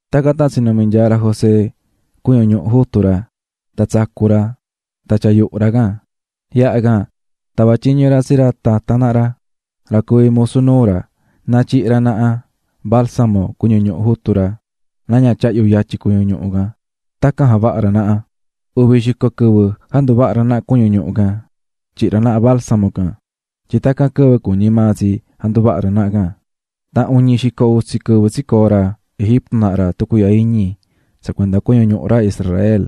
Tacan tan tsinumi̱ nyaa ra José cuñu ñuhu jutu ra tan tsacu̱ ra tan tyaa̱ yuhu ra can. Yaha can, tava̱ tyiñu ra tsi ra tatan naha ra, ra cuví musu nuu ra, na tyihi ra naha balsamo cuñu ñuhu jutu ra na ña tyahyu yatyi cuñu ñuhu can. Tacan javaha̱ ra naha ra. Uvi xico quɨvɨ janduvaha̱ ra cuñu ñuhu can tyihi̱ ra naha balsamo can, tyin tacan quɨvɨ cuñí maa tsi janduvaha ra naha can. Tan uñi xico utsi quɨvɨ tsicoo̱ ra Egipto naha ra tucuiihya iñi tsa cuenda cuñu ñuhu ra Israel.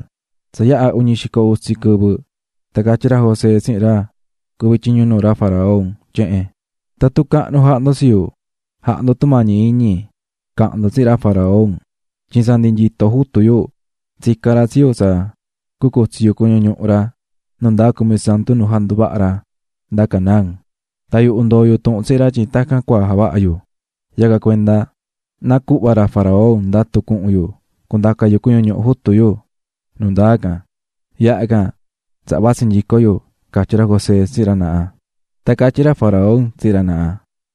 Tsa yaha uñi xico utsi quɨvɨ tan catyí ra José tsihin ra cuví tyiñu nuu ra faraón tyehen: --Tatun cahnu jahá ndo tsi yu, ja̱ha ndo tumañi iñi ca̱han ndo tsihin ra faraón. Tyin tsa ndi nyito jutu yu tsica̱n ra tsi yu tsa cucutsi yu cuñu ñuhu ra nu ndaa cumisantu nu janduvaha̱ ra nda Canaán, tan yuhu ndoo̱ yu tuhun tsihin ra tyin tacan cua javaha yu, yacan cuenda na cuhva ra faraón ndatu cuhun yu cundaca yu cuñu ñuhu jutu yu nu ndaa can, yaha can tsaha vatsi nyico yu ―catyí ra José tsihin ra naha. Tan catyí ra faraón tsihin ra naha: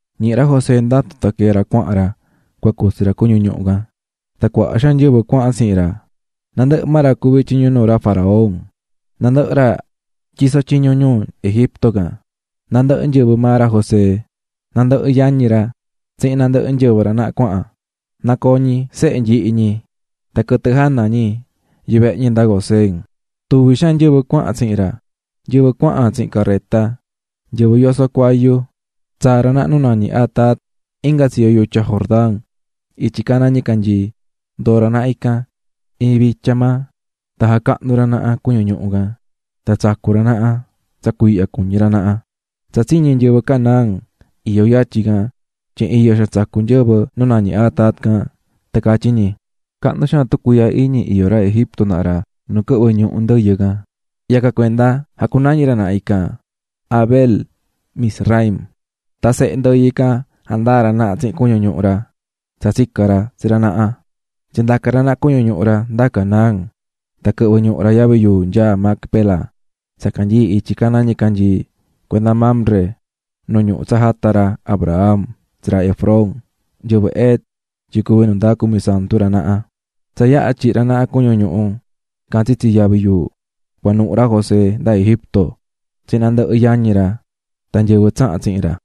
Ñihi̱ ra José ndatu tan quee̱ ra cuahan ra cua cutsi ra cuñu ñuhu can, tan cuaha xaan nyɨvɨ cuahan tsihin ra, nandɨhɨ ra cuví tyiñu nuu ra faraón, nandɨhɨ ra nyisó tyiñu ñuu Egipto can, nandɨhɨ nyɨvɨ maa ra José, nandɨhɨ yañi ra tsihin nandɨhɨ nyɨvɨ ra naha cuahan, nacoo̱ ñi sehe nyihi ñi tan quɨtɨ jana ñi yuvehe ñi nda Gosén. Tuvi xaan nyɨvɨ cuahan tsihin ra, nyɨvɨ cuahan tsihin careta tan nyɨvɨ yosó cuayu. Tsaa̱ ra naha nu nañí Atad inga tsiyo yutya Jordán, ityi caná ñicanyii. Ndoo̱ ra naha ican iin vitya maa tan jacahnu̱ ra naha cuñu ñuhu can tan tsacu̱ ra naha tsa cuiihya cuñí ra naha. Tsa tsiñi̱ nyɨvɨ Canaán iyó yatyin can tyin iyo xaan tsacú nyɨvɨ nu nañí Atad can tan catyí ñi: "Cahnu xaan tucuiihya iñi iyó ra Egipto naha ra nu quɨhvɨ́ ñuhu ndɨyɨ can." Yacan cuenda jacunañi̱ ra naha ican Abel-mizraim. Tan sehe ndɨyɨ can jandaa̱ ra naha tsihin cuñu ñuhu ra tsa tsica̱n ra tsi ra naha. Tsindaca̱ ra naha cuñu ñuhu ra nda Canaán tan quɨhvɨ̱ ñuhu ra yavi yuu nyaá Macpela tsa canyií ityi caná nicanyii cuenda Mamre, nu ñuhu tsa jata̱ ra Abraham tsi ra Efrón, nyɨvɨ Het, tyin cuvi nu ndaa cumisantu ra naha. Tsa yaha tyihi̱ ra naha cuñu ñuhu can tsitsi yavi yuu, cuanuhu̱ ra José nda Egipto tsihin nandɨhɨ yañi ra tan nyɨvɨ tsaha̱n tsihin ra.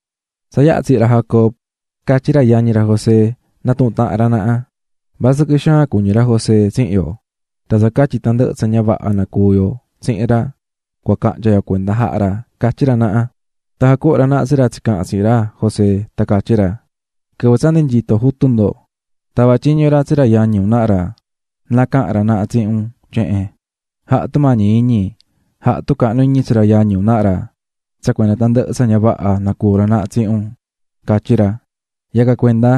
Tsa yaha tsihi̱ ra Jacob, catyí ra yañi ra José natuhún tahan ra naha: "Vasɨquɨ xaan cuñí ra José tsihin yo, tsa catyi tandɨhɨ tsa ña vaha nacuu̱ yo tsihin ra, cua cahnya yo cuenda jaha ra", catyí ra naha. Tan jacuhu̱n ra naha tsi ra tsicaha̱n tsihin ra José tan catyí ra: "Quɨvɨ tsa ndi nyitó jutu ndo, tava̱ tyiñu ra tsi ra yañi un naha ra na cahan ra naha tsihin un tyehen: ꞌJa̱ha tumañi iñi, ja̱ha tucahnu iñi tsi ra yañi un naha ra tsa cuenda tandɨhɨ tsa ña vaha nacuu̱ ra naha tsihin unꞌ, catyí ra. Yacan cuenda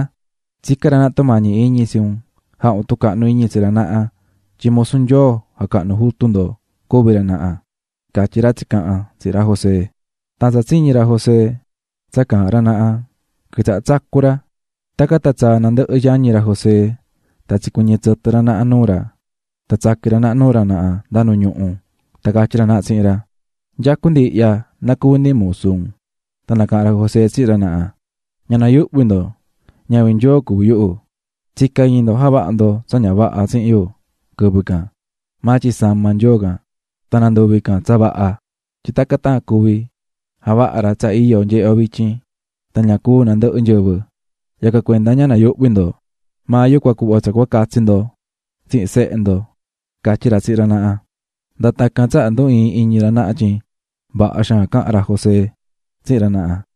tsicán ra naha tumañi iñi tsi un jaha un tucahnu iñi tsi ra naha tyin musu Nyoo jacahnu̱ jutu ndo cuví ra nahaꞌ", catyí ra tsicaha̱n tsihin ra José. Tan tsa tsiñi̱ José tsa caahán ra naha quitsaha̱ tsacú ra. Tacan tan tsaa̱ nandɨhɨ yañi ra José tan tsicuɨñɨ̱ tsɨtɨ ra naha nuu ra tan tsaqui̱n ra naha nuu ra naha nda nu ñuhu tan catyí ra naha tsihin ra: --Nyacú ndi ihya na cuvi ndi musu un. Tan nacaha̱n ra José tsihin ra naha: --Ña nayuhvi ndo, ñavin Nyoo cuví yuhu. Tsica̱ iñi ndo javaha ndo tsa ña vaha tsihin yu quɨvɨ can, maa tyin sama̱ Nyoo can tan nanduvi̱ can tsa vaha, tyin tacan tan cuvi javaha ra tsa iyo nyehé yo vityin, tan ña cúu nandɨhɨ nyɨvɨ. Yacan cuenda ña nayuhvi ndo; maa yu cua cuhva tsa cua catsi ndo tsihin sehe ndo --catyí ra tsihin ra naha. Nda tacan tsaha ndu ii̱n iñi ra naha tyin vaha xaan caha̱n ra José tsihin ra naha.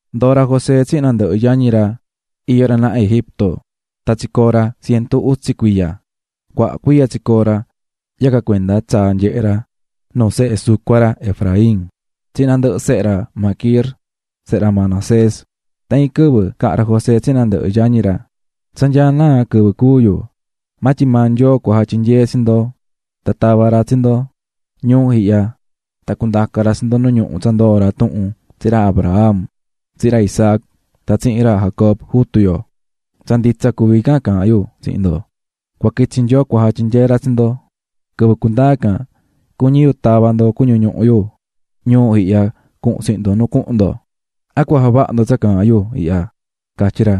Ndoo̱ ra José tsihin nandɨhɨ yañi ra iyó ra naha Egipto, tan tsicoo̱ ra cientu utsi cuiya. Cuaha cuiya tsicoo̱ ra, yacan cuenda tsaa̱ nyehe̱ ra nuu sehe sucua ra Efraín tsihin nandɨhɨ sehe ra Maquir, sehe ra Manasés. Tan iin quɨvɨ caha̱n ra José tsihin nandɨhɨ yañi ra: "Tsa nyaá naa quɨvɨ cúu yu, maa tyin maa Nyoo cua jatyinyee tsi ndo tan tava ra tsi ndo ñuu ihya tan cundaca ra tsi ndo nu ñuhu tsa ndoo̱ ra tuhun tsihin ra Abraham, tsihin ra Isaac tan tsihin ra Jacob, jutu yo. Tsa nditsa cuví can caahán yu tsihin ndo, cua quitsi Nyoo cua jatyinyee ra tsi ndo. Quɨvɨ cundaa can, cuñí yu tava ndo cuñu ñuhu yu ñuu ihya cuhun tsihin ndo nu cuhun ndo. ¿A cua javaha ndo tsa caahán yu ihya?", catyí ra.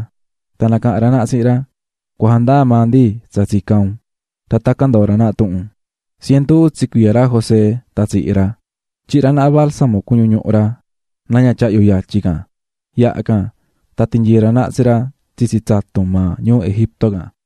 Tan nacaha̱n ra naha tsihin ra: "Cua jandaa maa ndi tsa tsicán un." Tan tacan ndoo̱ ra naha tuhun. Cientu utsi cuiya ra José tan tsihi̱ ra, tyihi̱ ra naha balsamo cuñu ñuhu ra na ña tyahyu yatyi can, yaha can tan tinyii̱ ra naha tsi ra tsitsi tsatun maa ñuu Egipto can.